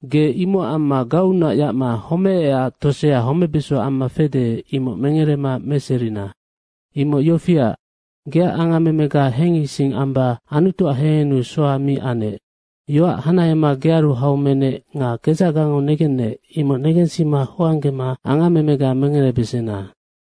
Ge imocac amma gauunac yacma homeecac tosea homebeso amma fede, imoc mengerema meserina. Imoc yofiac, geac angammemega hengising amba Anutuac hehennu soha mi anec. Yoac hanahema gearu hau menec nga kedzacgango negennec, imoc negensima hoanggema angammemega mengerebesena.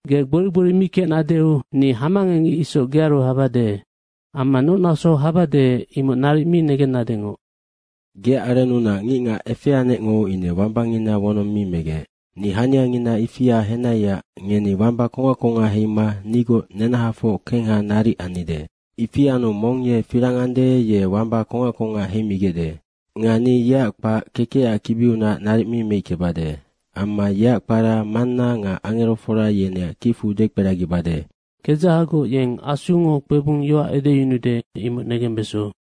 Ge gbori gbori mi kecnadeu ni hamangecngic isoc gearu habade. Amma noc nasou habade, imoc naric mi negennadengoc.’” “Anu geac arennunac ngicngac efeanecngo ine wambangina wonong mi megec. Ni haniangina ifia henaiac ngeni wamba kongac kongac heima nigoc nenahafoc kengha naric annide. Ifi anu mong ye firang ande, ye wamba kongac kongac heimigecde. Nga ni yeac kpac kekecac kibiunac naric mi meickebade. Amma yeac kpara Manna nga angerofora yeneac kicfu dekperagibade. Kedzahagoc yeng Asungo kpebung yoac edeyunude, imoc negembeso.”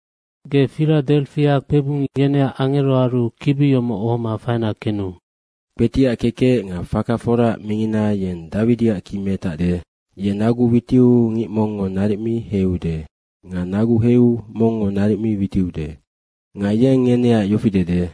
“Ge Firadefia kpebung yeneac angeroaru kibi yomoc ohoma faina kenu.” “Kpetiac kekec nga faka foraac mingina, yeng Dawidiac ki metacde. Ye nagu witiu ngic mongngo naric mi heiude nga nagu heiu mongngo naric mi witiude. Nga yeng ngeneac yofi dede,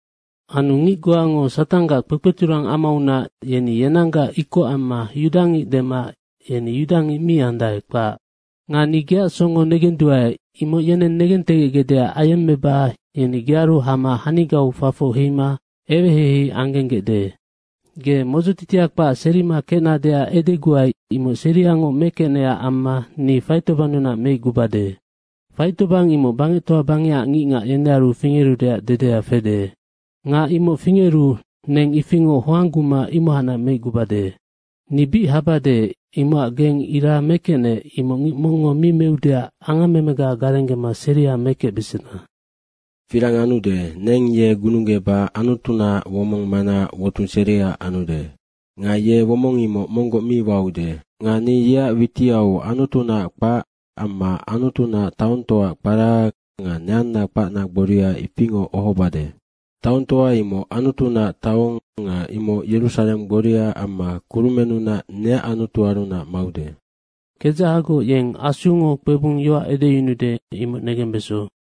‘Anu ngic goango Satanggac kpekpeturang amaunac, yeni yenanggac ikoc amma yudangic dema yeni yudangic mi andae, kpac. Nga ni geac songo negenduae, imoc yeneng negentegecgecdeac ayemmeba yeni gearu hama hanigau fafoc heima ewehei anggenggecde. Ge modzotitia kpac serima kecnadeac edeguai, imoc seriangoc mekecnecac amma ni faitobannunac meicgubade. Faitobang imoc bangectoa bangecac ngicngac yenearu fingerudeac dedea fede. Nga imoc fingeru neng ifingoc hoangguma imohacnac meicgubade.’ ‘Ni bic habade, imocac geng ira mekecnec, imoc ngic mongngo mi meudeac angammemega garenggema seria mekecbesena. Firang anude, neng ye gununggeba Anutunaac womong manaac wotung seria anude. Nga ye womong imoc monggoc mi waude. Nga ni yeac witiau Anutunaac kpac amma Anutunaac taongtoaac kpara nga neanna kpacna gboria ifingoc ohobade. Taongtoa imoc Anutunaac taong nga imoc Yerusareng gboria amma kurumennunac neac Anutuarunac maude.’ Kedzahagoc yeng Asungo kpebung yoac edeyunude, imoc negembeso.”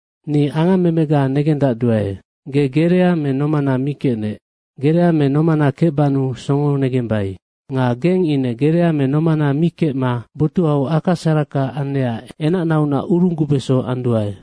‘Ni angammemega negendacduae. Ge gerea me nomana mi kecnec. Gerea me nomana kecbannu songo negembai. Nga geng ine gerea me nomana mi kecma botuhau aka saraka annecac enacnaunac urunggubeso anduae.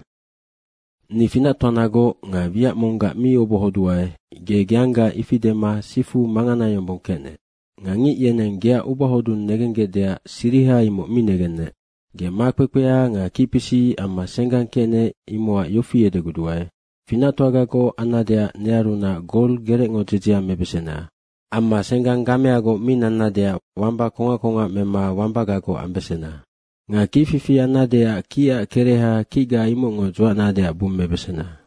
Ni finactoanagoc nga wiac monggac mi obohoduae, ge geanggaac ifi dema sifu mangana yombong kecnec nga ngic yeneng geac ubahodung negenggecdeac siriha, imoc mi negennec. Ge makpekpea nga kicpisic amma senggang kecnec, imocac yofi edeguduae, finactoagagoc annadeac nearunac gol gerecngo dzedzea mebesena. Amma senggang gameagoc mi nannadeac wamba kongac kongac mema wambagagoc ambesena. Nga kicfifi annadeac kicac kereha kicga imocngo dzuacnadeac bummebesena.’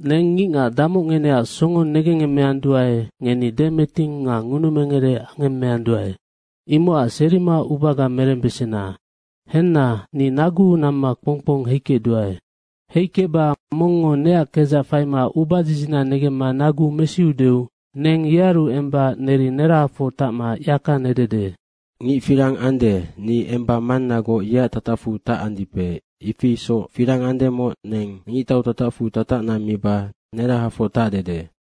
‘Neng ngicngac damoc ngeneac songo negengngemmeanduae, ngeni demeting nga ngunumengere angemmeanduae. Imocac serima ubaga merembesena. Henna, ni naguu namma kpong kpong heikecduae. Heikecba mongngo neac kedzac faima ubadzidzina negemma nagu mesideu neng yearu emba neri nerahafoc tacma yaka nedede.’ ‘Ngic firang ande, ni emba Mannagoc yeac tatacfu tacandipe, ifi isoc firang andemoc neng ngictau tatacfu tatacna miba nerahafoc tacdede.